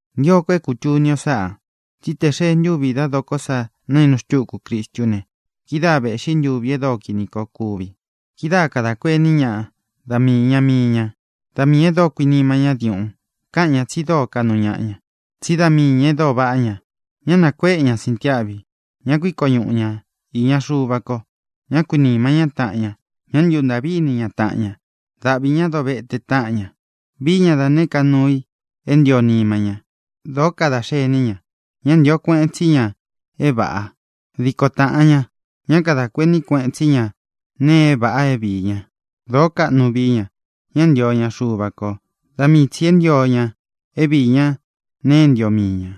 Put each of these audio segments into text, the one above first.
Ntio ko é kūtuni o sáꞌā: Tsí tē xee ntúvi dá dokó sa naínu xtúku Cristú ne, kidáa vēꞌxí ntuvi e dóo kīni koo kuvi. Kidáa kadā kuení ñaꞌa da mii īña mii ña, dá miī e dóo kuinima ñá diuꞌun. Káꞌan ñā tsi dóo kaꞌnu ñaꞌa ña, tsí da mii ñā e dóo vaꞌá ña. Ñá nākuéꞌe ña síntiáꞌvi. Ñá kuiko ñuꞌu ña īña Xuva ko. Ñá kuīnima ñá taꞌan ña. Ñá ntuntāꞌví ini ña taꞌan ña. Dáꞌvi ñā dovete táꞌan ña. Vií ña da nēé ka nuu i é ntio nima ña. Dōó kadā xení ña. Ñá ntio kueꞌen tsí ña é vāꞌa. Diko tāꞌan ña. Ñá kadā kuení kueꞌen tsí ña nēe e váꞌā é viī ña. Dōó kaꞌnu vií ña. Ñá ntio ña Xuva kō; da mii tsī é ntio ña é viī ñá nēe é ntio mii ñā.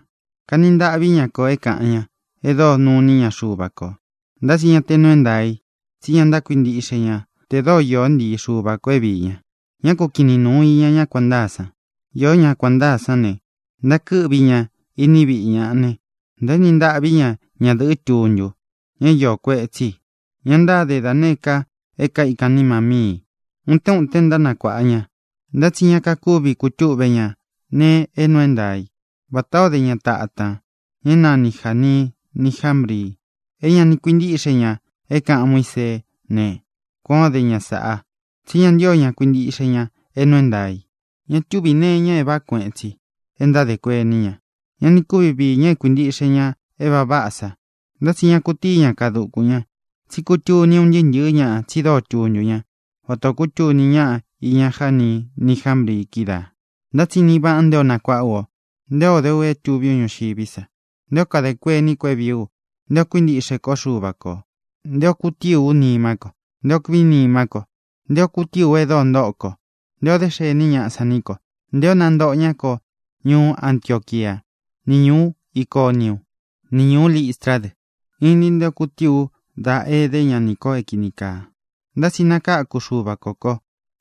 Kani ntaꞌví ña kō é kāꞌan ñá e dóo nuní ña Xuva kō. Ntá tsi ña te nuu é ntaā i. Tsí ña ntákuintíꞌxe ña tē dóo īó ntii Xuva kō é viī ña. Ñá ku kinin nūun iña ñá kuān ntáa san. Iō ñá kuān ntáa sán ne, ntákɨ́ꞌvi ña iní viꞌi ñaꞌa ne, ntaéni ntaꞌví ña ñadɨ̄ꞌɨ́ tuntu, ña é iō kuetsí i, ña ntáde da nēé ka é kaikán nima míi ī. Utén utén ntánakuāꞌa ña, ntá tsi ñá kakúvi kutúꞌve ña nēe é nuu é ntaā i. Vatā o dé ña tatan, ña é nanī Jani ni Jámbri, é ña ni kuintíꞌxe ña é kāꞌan Muíseé ne, kuān ó de ña sāꞌa, tsí ña ntío ña kuintiꞌxe ñā é nuu é ntaā i. Ña túvī nee iña é vāꞌá kueꞌen tsi e ntádē kuení ña. Ña ni kúvi viī ña é kuīntiꞌxe ña é vāꞌa váꞌa sa. Ntá tsi ña kutíi ña kaa dukūn ña, tsí kutuni un ntɨɨ́ ntɨ̄ɨ́ ñaꞌa tsi dóo tuntu ñá, vatā o kútuni ñáꞌa iña Jani ni Jámbri kídaā. Ntá tsi inin vaꞌan nté o nakuaꞌá u, nté o de u é tuví u ñuxiví sa, nté o kadē kuení ko é vīí u, nté ō kuíntiꞌxe kó Xuva kō, nté ō kutíi ú nimá ko, nté ō kuinimá ko, nté ō kutíi ú e dóo ntóꞌo kó, nté ō dé xení ñaꞌa san ní ko, nté ō nántoꞌo ñá ko ñuú Antioquiá ni ñūú Iconiú, ni ñūú Listrá dɨ. Inin nté ō kutíi u dá ēdé ña nī ko é kīni kaa. Ntá tsi nakáku Xuva kō ko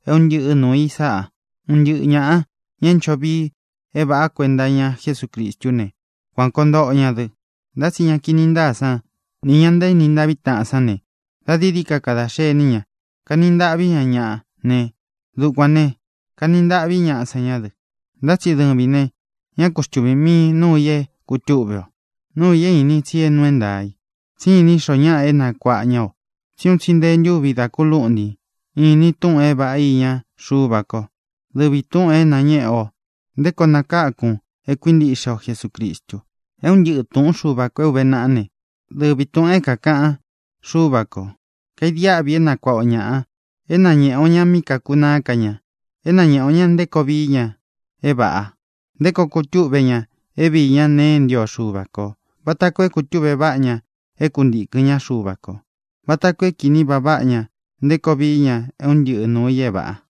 é un ntɨꞌɨ nuū i sáꞌa. Un ntɨꞌɨ ñāꞌa, ña é ncho vii é vāꞌá kuenta iña Jesúcristú ne, kuān koo ntoꞌo ña dɨ. Ntá tsi ña kini ntáa sán nī ña ntaéni ntaꞌví taꞌan sán ne, da dií dií ka kadā xení ña. Kani ntaꞌví ña ñaꞌa ne, dukuān ne, kani ntaꞌví ñaꞌa san ñá dɨ. Ntá tsi dɨvīn ne, ñá ku xtuvīn miin núu ī é kūtúꞌve o, nuu i é īnin tsi nuu é ntaā i, tsí inín xoo ñáꞌa é nakuāꞌa ña o. Tsí un tsi nte ntúvi da kulúꞌntin īnin túꞌūn é vāꞌá iña Xuva kó, dɨvi tūꞌun é nañéꞌe o nté koo nakákun é kuīntiꞌxe o Jesucristu. É un ntɨꞌɨ tūꞌún Xuva kō é ūve naꞌá ne, dɨvi tūꞌun é kākaꞌan Xúva kō. Kaidiáꞌvi é nakuaꞌa o ñāꞌa, é nañēꞌe o ña míꞌi kākunaá ka ña, é nañēꞌe o ña nté koo vií ña é vāꞌa, nté koo kutúꞌve ñā é viī ñá nēe é ntio Xuva kō, vata koo é koo túꞌve vaꞌá ña é kuntīkɨn ñá Xuva kō, vata koo é kīni vaꞌa váꞌa ña nté koo vií ña é un ntɨꞌɨ nūu i é vāꞌa.